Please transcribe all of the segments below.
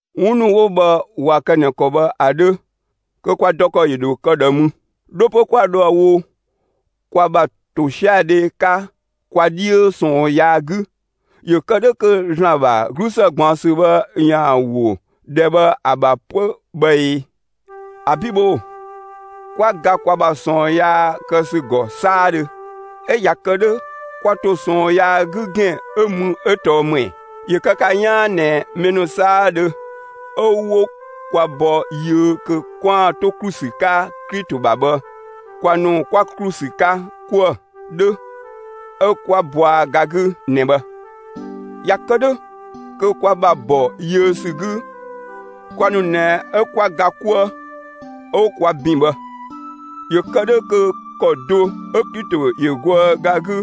'Wun ‑nu 'wo bhë ꞊wa kë ꞊nɛ ‑kɔ bhë ‑a 'dhö, kö kwa dɔ ‑kɔ ‑yö ‑dho kë ꞊dhë mü? 'Dho 'pö 'kwa dhoë‑ wo kwa ‑bha ‑tosiadhe 'ka kwa 'dhiö ꞊sɔɔn yaa 'gü ‑yö kë 'dhö kö ‑Zlan ‑bha 'glusë ꞊gbaɔnsü bhë ‑yaan ‑wo ‑dhɛ bhë ‑a ‑bha 'pö bhë ee? ‑Abi' bhoo‑! 'Kwa ga kwa ‑bha ꞊sɔɔn yaa kë ‑sü ‑gɔ 'saadhö. 'Ö ꞊ya kë 'dhö kwa ‑to ꞊sɔɔn yaa 'gü ‑gɛn 'ö mü 'ö tɔɔ ‑më ‑ɛ? ‑Yö kë ka 'yaan ꞊nɛ mɛ ‑nu 'saadhö 'ö 'wo kwa bɔ yiö kö 'kwaan‑ 'to ‑klu ‑sü 'ka Klito ‑bha bhë, kwa ‑nu kwa ‑klu ‑sü 'ka 'kuë‑ 'dhö 'ö 'kwa bɔa ga 'gü ꞊nɛ bhë. ꞊Ya kë 'dhö, kö kwa ‑bha ‑bɔ yiö ‑sü 'gü, kwa ‑nu ꞊nɛ 'ö 'kwa ga 'kuë 'ö 'wo kwa ‑bin bhë, ‑yö kë 'dhö kö ‑kɔ do 'ö Klito ‑yö goë ga 'gü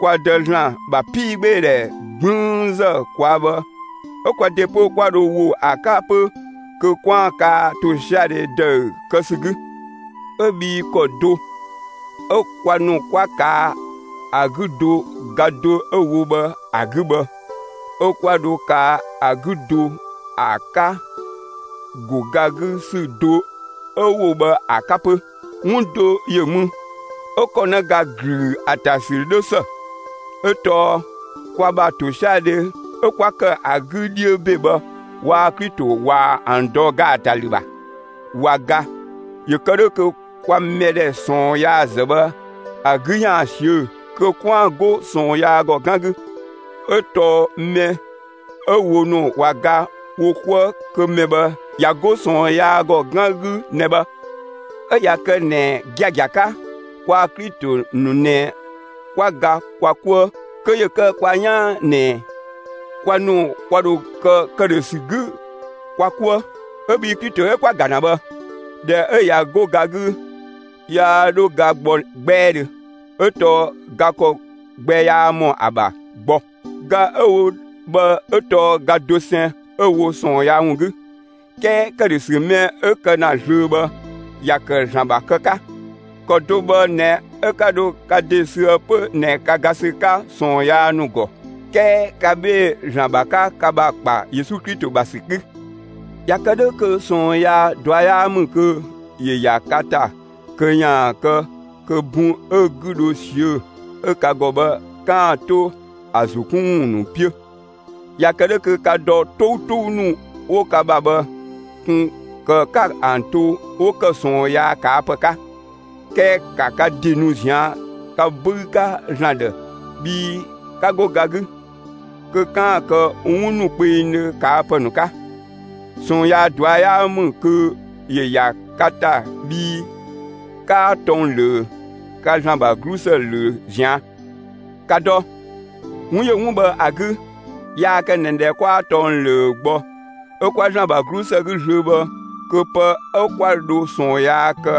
kwa Dë (‑Zlan) ‑bha 'piigbeedhɛ 'gblüünzë ꞊kwaa' bhë 'ö kwa ‑de 'pö 'kwa dho ‑wo ‑a 'ka 'pö kö 'kwaan‑ kaa ‑tosiadhe ‑dëü kë ‑sü 'gü. 'Ö bhii ‑kɔ do 'ö kwa ‑nu 'kwa ꞊kaa' ‑a 'gü do ga do 'ö‑ wo bhë ‑a 'gü bhë 'ö 'kwa dho kaa ‑a 'gü do ‑a 'ka ‑go ga 'gü ‑sü do 'ö‑ wo bhë ‑a 'ka 'pö. 'Wun do ‑yö mü 'ö ‑kɔnëga ‑glüü ‑a ‑ta ‑sü 'dhö ‑së; 'ö tɔɔ kwa ‑bha ‑tosiadhe 'ö 'kwa ‑kë ‑a 'gü 'dhiö ‑be bhë, waa‑ Klito ꞊waa‑ ‑an dɔ ‑gaatalü ‑bha, ꞊wa ga ‑yö kë 'dhö kö kwa mɛdhɛ ꞊sɔɔn yaazë bhë ‑a 'gü ‑yaan ꞊siö' kö 'kwaan‑ 'go ꞊sɔɔn yaa ‑gɔ 'gan 'gü. 'Ö tɔɔ mɛ 'ö wo ‑nu ꞊wa ga wo 'kuë‑ kö mɛ bhë ꞊ya 'go ꞊sɔɔn yaa ‑gɔ 'gan 'gü ꞊nɛ bhë. 'Ö ꞊ya kë ꞊nɛ (giagia 'ka) kwaa‑ Klito ‑nu ꞊nɛ 'kwa ga kwa 'kuë, kö ‑yö kë kwa 'yaan ꞊nɛ kwa ‑nu kwa ‑dho kë ‑këdhösü 'gü kwa 'kuë. 'Ö bhii Klito 'ö 'kwa‑ ‑ga ‑na bhë, ꞊dhɛ 'ö ꞊ya 'go ga 'gü, yaa 'dhö ga gbɔ 'gbɛɛdhö, 'ö tɔɔ ga ‑kɔ gbɛ 'yaa ‑mɔ ‑a ‑bha gbɔ. Ga 'ö‑ wo bhë 'ö tɔɔ ga dosɛn 'ö‑ wo ꞊sɔɔn yaa ‑wun 'gü. 'Kɛɛ ‑këdhösü mɛ 'ö‑ kë ‑na zlöö bhë, ‑ya ‑kë ‑Zlan ‑bha kë 'ka. ‑Kɔ do bhë ꞊nɛ 'ö 'ka dho ka ‑de süë 'pö ꞊nɛ ka ga ‑sü 'ka ꞊sɔɔn yaa ‑nu ‑gɔ; 'kɛɛ ka 'bhee‑ ‑Zlan ‑bha 'ka ka ‑bha ‑kpa Yesu Klito ‑bha ‑sü 'gü. ꞊Ya kë 'dhö kö ꞊sɔɔn yaa ꞊dua' 'yaa ‑mü kö ‑yö ‑ya ka ‑ta kö ‑yaan kë kö bun 'ö‑ 'gü dho ꞊siö' 'ö ka ‑gɔ bhë, 'kaan‑ 'to ‑a ‑zo 'kun ‑wun ‑nu 'piö. ꞊Ya kë 'dhö kö ka dɔ 'toutou ‑nu 'wo ka ‑bha bhë, ꞊kun ‑kë 'ka ‑an to 'wo ‑kë ꞊sɔɔn yaa ꞊kaa' ‑pë 'ka. 'Kɛɛ ‑ka ka ‑de nu ꞊zian' ka 'böü 'ka ‑Zlan ‑dhë bhii 'ka 'go ga 'gü, kö 'kaan‑ kë 'wun ‑nu kpengdhö ꞊kaa' ‑pë ‑nu 'ka. ꞊Sɔɔn yaa ꞊dua' 'yaa ‑mü kö ‑yö ‑ya ka ‑ta bhii 'kaa tɔng ꞊löö; ka ‑Zlan ‑bha 'glusë ꞊löö ꞊zian'. ‑Ka dɔ! 'Wun ‑yö 'wun bhë ‑a 'gü, yaa kë ꞊nɛ ꞊dhɛ 'kwaa tɔng ꞊löö gbɔ 'ö 'kwa ‑Zlan ‑bha 'glusë 'gü zlöö bhë kö pë 'ö 'kwa dho ꞊sɔɔn yaa kë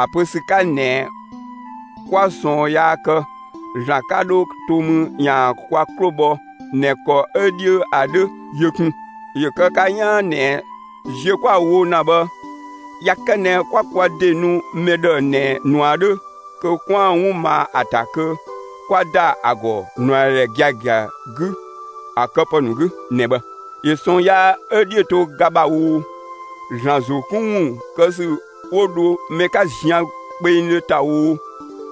(‑a pö ‑sü 'ka ꞊nɛ 'kwa ꞊sɔɔn yaa kë, ‑Zlan 'ka 'dho to mü ‑yaan kwa 'klo ‑bhɔ ꞊nɛ ‑kɔ 'ö 'dhiö ‑a 'dhö) yö kun. ‑Yö kë ka 'yaan ꞊nɛ ziö 'kwa‑ wo ‑na bhë, ꞊ya kë ꞊nɛ 'kwa kwa ‑de nu mɛ ‑dhë ꞊nɛ ꞊nua 'dhö kö 'kwaan‑ 'wun ma ‑a ‑ta kö 'kwa ‑da ‑a ‑gɔ ꞊nuadhɛ giagia 'gü ‑a këpë ‑nu 'gü ꞊nɛ bhë. ‑Yö ꞊sɔɔn yaa 'ö‑ 'dhiö‑ to ga ‑bha oo, ‑Zlan ‑zo 'kun ‑wun kë ‑sü 'wo dho mɛ 'ka zian kpengdhö ‑ta oo,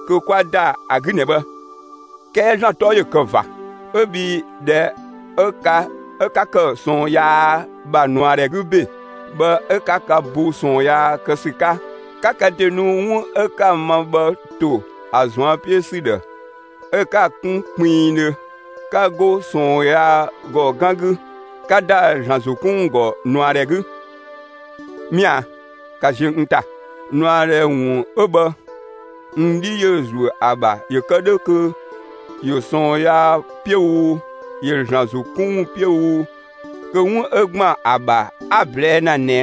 kö 'kwa ‑da ‑a 'gü ꞊nɛ bhë. 'Kɛɛ ‑Zlan 'tɔ ‑yö kë ꞊va 'ö bhii ꞊dhɛ 'ö ka 'ö 'ka ‑kë ꞊sɔɔn yaa ‑bha ꞊nuadhɛ 'gü ‑be bhë 'ö 'ka ka bo ꞊sɔɔn yaa kë ‑sü 'ka, 'ka ka ‑de nu 'wun 'ö 'ka‑ ma bhë ‑to ‑a ꞊zuan' 'piö ‑sü ‑dhë 'ö 'ka‑ kun kpinngdhö. 'Ka 'go ꞊sɔɔn yaa ‑gɔ 'gan 'gü, 'ka ‑da ‑Zlan ‑zo 'kun ‑wun ‑gɔ ꞊nuadhɛ 'gü. Mɛa‑, ‑ka ziö n ‑ta. ꞊Nuadhɛ ‑wun 'ö bhë, n 'dhi ‑yö ‑zuö ‑a ‑bha ‑yö kë 'dhö kö ‑yö ꞊sɔɔn yaa 'piö oo, ‑yö ‑Zlan ‑zo 'kun ‑wun 'piö oo, kö 'wun 'ö ‑gban ‑a ‑bha, 'a‑ ꞊blɛɛ' ‑na ꞊nɛ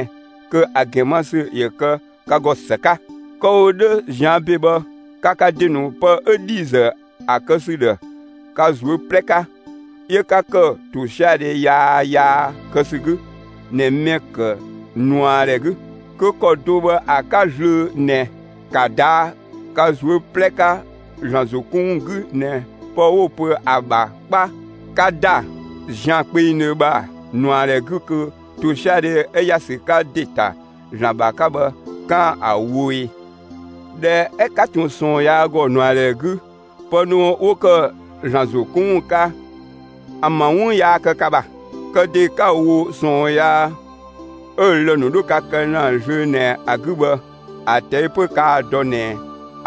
kö ‑a ‑gɛn ma ‑sü ‑yö kë ka ‑gɔ ‑së 'ka. Kë‑ wo 'dhö ꞊zian' ‑be bhë, ka ka ‑de ‑nu pë 'ö ‑dhiizë ‑a kë ‑sü ‑dhë ka ꞊zuö' 'plɛ 'ka, 'yö 'ka ‑kë ‑tosiadhe yaa yaa kë ‑sü 'gü ꞊nɛ mɛ‑ ‑kë ꞊nuadhɛ 'gü; kö ‑kɔ do bhë ‑a 'ka, zlöö ꞊nɛ ‑ka ꞊daa' ka ꞊zuö' 'plɛ 'ka ‑Zlan ‑zo 'kun ‑wun 'gü ꞊nɛ pë 'wo‑ pö ‑a ‑bha 'kpa 'ka ‑da zian kpengdhö ‑bha ꞊nuadhɛ 'gü kö ‑tosiadhe 'ö ‑ya ‑sü 'ka ‑de ‑ta ‑Zlan ‑bha 'ka bhë, 'kaan‑ ‑a wo ꞊e. ꞊Dhɛ 'ö 'ka ꞊tun ꞊sɔɔn yaa ‑gɔ ꞊nuadhɛ 'gü, pë ‑nu 'wo ‑kë ‑Zlan ‑zo 'kun ‑wun 'ka, ‑an ‑bha 'wun yaa kë ka ‑bha. Kë ‑de 'ka‑ wo ꞊sɔɔn yaa 'ö‑ lë‑ ‑nu 'dhö ka kë ‑na zlöö ꞊nɛ ‑a 'gü bhë, ‑a ꞊tɛi' 'pö kaa‑ ‑dɔ ꞊nɛ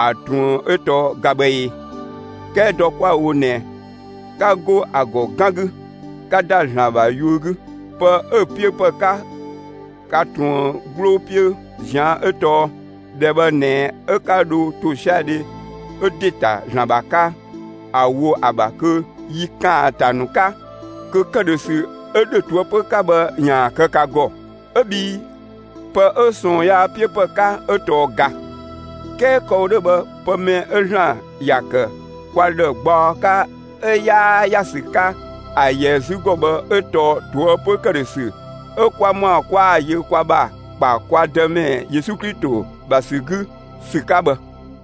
‑a ꞊truën 'ö tɔɔ ga bhë ee? 'Kɛɛ dɔ 'kwa‑ wo ꞊nɛ, 'ka 'go ‑a ‑gɔ 'gan 'gü, 'ka ‑da ‑Zlan ‑bha yuö 'gü. Pë 'ö‑ 'piö ‑pë 'ka ka ꞊truën 'gbloo 'piö ꞊zian' 'ö tɔɔ ‑dhɛ bhë ꞊nɛ 'ö 'ka dho ‑tosiadhe ö ‑de ‑ta ‑Zlan ‑bha 'ka ‑a wo ‑a ‑bha kö yi ‑kaanta ‑nu 'ka, kö ‑këdhösü 'ö ‑dhö ꞊toëpö 'ka bhë ‑yaan kë ka ‑gɔ. 'Ö bhii pë 'ö ꞊sɔɔn yaa 'piö ‑pë 'ka ö tɔɔ ga. 'Kɛɛ kë‑ wo 'dhö bhë pë mɛ 'ö ‑Zlan ‑ya ‑kë kwa ‑dhë gbaɔ 'ka 'ö 'yaa ‑ya ‑sü 'ka ‑a ‑yɛ 'zü ‑gɔ bhë 'ö tɔɔ ꞊toëpö ‑këdhösü 'ö 'kwa ‑mɔa 'kwa‑ yö kwa ‑bha ‑kpa kwa Dëmɛ Yesu Klito ‑bha ‑sü 'gü ‑sü 'ka bhë.